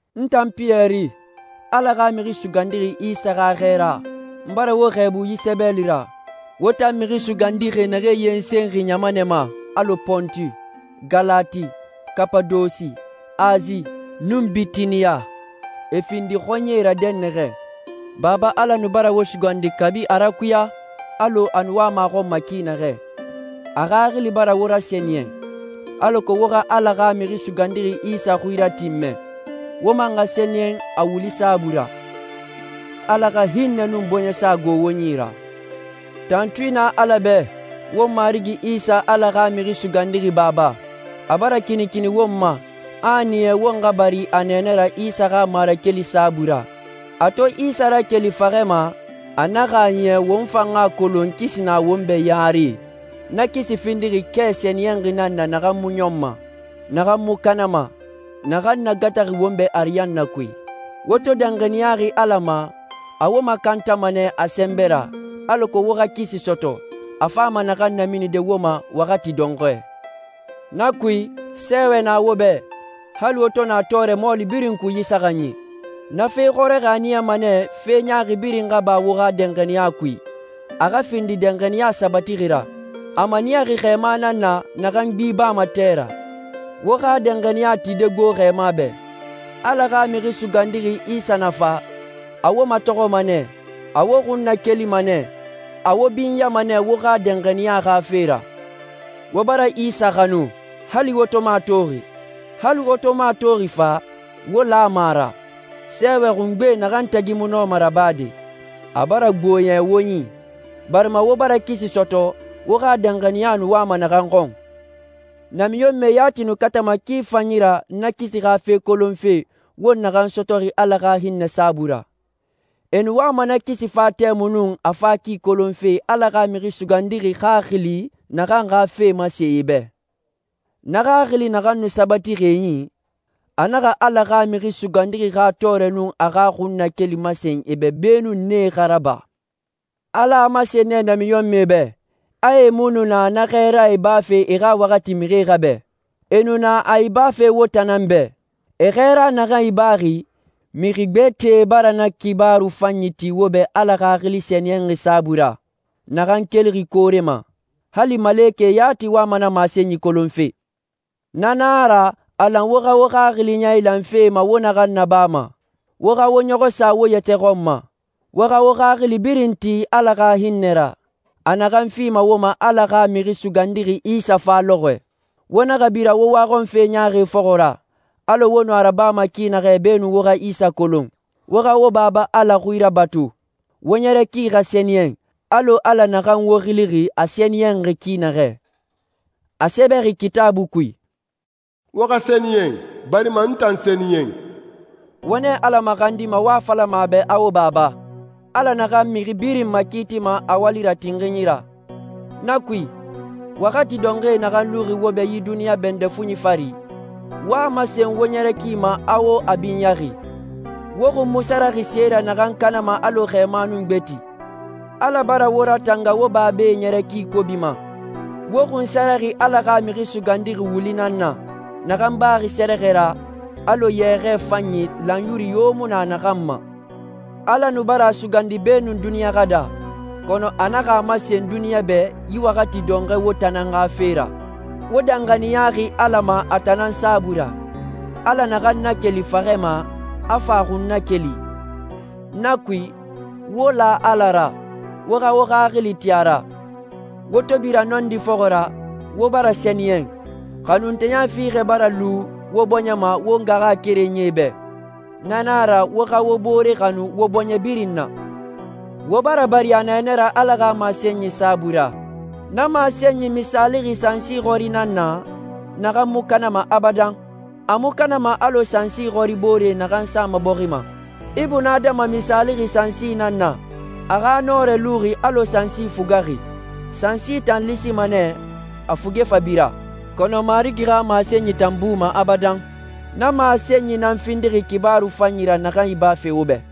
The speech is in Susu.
N tan Piyɛri, Ala xa Mixi Sugandixi Isa xa xɛɛra, n bara wo xɛɛbu yi sɛbɛli ra, wo tan mixi sugandixi naxee yensenxi ɲamanɛe ma alɔ Pontu, Galati, Kapadose, Asi, nun Bitiniya, e findi xɔɲɛe ra dɛnnaxɛ. Baba Ala nu bara wo sugandi kabi a rakuya alɔ a nu wama a xɔn ma ki naxɛ. A Xaxili bara wo rasɛniyɛn, alako wo xa Ala xa Mixi Sugandixi Isa xui ratinmɛ, wo man xa sɛniyɛn a wuli saabui ra. Ala xa hinnɛ nun bɔɲɛsa xa gbo wo yi ra. Tantui na Ala bɛ, won Marigi Isa Ala xa Mixi Sugandixi Baba. A bara kinikini won ma, a a niya won xa bari a nɛɛnɛ ra Isa xa marakeli saabui ra. A to Isa rakeli faxɛ ma, a naxa a niya won fan xa a kolon kisi na won bɛ yare. Na kisi findixi kɛ sɛniyɛnxi nan na naxan mu ɲɔnma, naxan mu kanama, naxan nagataxi won bɛ ariyanna kui. Wo to danxaniyaxi Ala ma, a wo makantama nɛ a sɛnbɛ ra, alako wo xa kisi sɔtɔ, a fama naxan naminide wo ma waxati dɔnxɔɛ. Na kui, sɛɛwɛ na wo bɛ, hali wo to na tɔɔrɛ mɔɔli birin kui yi saxanyi. Na fe xɔrɔxɔɛe a niyama nɛ fe ɲaaxi birin xa ba wo xa danxaniya kui, a xa findi danxaniya sabatixi ra. A maniyaxi xɛɛma nan na naxan gbi bama tɛ ra. Wo xa danxaniya tide gbo xɛɛma bɛ. Ala xa Mixi Sugandixi Isa na fa, a wo matɔxɔma nɛ, a wo xun nakelima nɛ, a wo binyama nɛ wo xa danxaniya xa fe ra. Wo bara Isa xanu, hali wo to mu a toxi. Hali wo to mu a toxi fa, wo lama a ra. Sɛɛwɛ xungbe naxan tagi mu nɔma rabade, a bara gbo yɛ wo yi, barima wo bara kisi sɔtɔ, wo xa danxaniya nu wama naxan xɔn. Namiɲɔnmɛe yati nu katama ki fanyi ra na kisi xa fe kolonfe wo naxan sɔtɔxi Ala xa hinnɛ saabui ra. E nu wama na kisi fa tɛmui nun a fa ki kolonfe Ala xa Mixi Sugandixi Xaxili naxan xa fee masen e bɛ. Na Xaxili naxan nu sabatixi e i, a naxa Ala xa Mixi Sugandixi xa tɔɔrɛ nun a xa xunnakeli masen e bɛ beenun nee xa raba. Ala a masen nɛ namiɲɔnmɛe bɛ, a e mu nu na xɛɛra ibafe e xa waxati mixie xa bɛ. E nu na a ibafe wo tan nan bɛ. E xɛɛra naxan ibaxi, mixi gbɛtɛe bara na xibaaru fanyi ti wo bɛ Ala Xaxili Sɛniyɛnxi saabui ra, naxan kelixi koore ma. Hali malekɛe yati wama na masenyi kolonfe. Na nan a ra, a lan wo xa wo xaxili yailan fe ma wo naxan nabama, wo xa wo ɲɔxɔ sa wo yɛtɛ xɔn ma, wo xa wo xaxili birin ti Ala xa hinnɛ ra, a naxan fima wo ma Ala xa Mixi Sugandixi Isa fa lɔxɔɛ. Wo naxa bira wo waxɔnfe ɲaaxi fɔxɔ ra alɔ wo nu a rabama ki naxɛ beenun wo xa Isa kolon. Wo xa wo Baba Ala xui rabatu. Wo ɲɛrɛ ki xa sɛniyɛn alɔ Ala naxan wo xilixi a sɛniyɛnxi ki naxɛ. A sɛbɛxi Kitaabui kui, «Wo xa sɛniyɛn, barima n tan sɛniyɛn.» Wo nɛ Ala maxandima, wo a falama a bɛ a wo Baba, Ala naxan mixi birin makiitima a wali ra tinxinyi ra. Na kui, waxati dɔnxɔɛ naxan luxi wo bɛ yi duniɲa bɛndɛ fuɲi fari, wo a masen wo ɲɛrɛ ki ma a wo a binyaxi. Wo xun mu saraxi se ra naxan kanama alɔ xɛɛma nun gbeti. Ala bara wo ratanga wo babae ɲɛrɛ ki kobi ma. Wo xunsaraxi Ala xa Mixi Sugandixi wuli nan na, naxan baxi sɛrɛxɛ ra, alɔ yɛxɛɛ fanyi lanyuru yo mu na naxan ma. Ala nu bara a sugandi beenun duniɲa xa daa, kɔnɔ a naxa a masen duniɲa bɛ yi waxati dɔnxɔɛ wo tan nan xa fe ra. Wo danxaniyaxi Ala ma a tan nan saabui ra, Ala naxan nakeli faxɛ ma, a fa a xun nakeli. Na kui, wo la Ala ra, wo xa wo xaxili ti a ra. Wo to bira nɔndi fɔxɔ ra, wo bara sɛniyɛn, xanunteya fiixɛ bara lu wo bɔɲɛ ma wo ngaxakerenyie bɛ. Na na a ra wo xa wo bore xanu wo bɔɲɛ birin na. Wo bara bari a nɛɛnɛ ra Ala xa masenyi saabui ra. Na masenyi misaalixi sansi xɔri nan na, naxan mu kanama abadan. A mu kanama alɔ sansi xɔri boore naxan sama bɔxi ma. Ibunadama misaalixi sansi nan na. A xa nɔrɛ luxi alɔ sansi fugaxi. Sansi tan lisima nɛ, a fuge fa bira, kɔnɔ Marigi xa masenyi tan buma abadan. Na masenyi nan findixi xibaaru fanyi ra naxan ibaxi wo bɛ.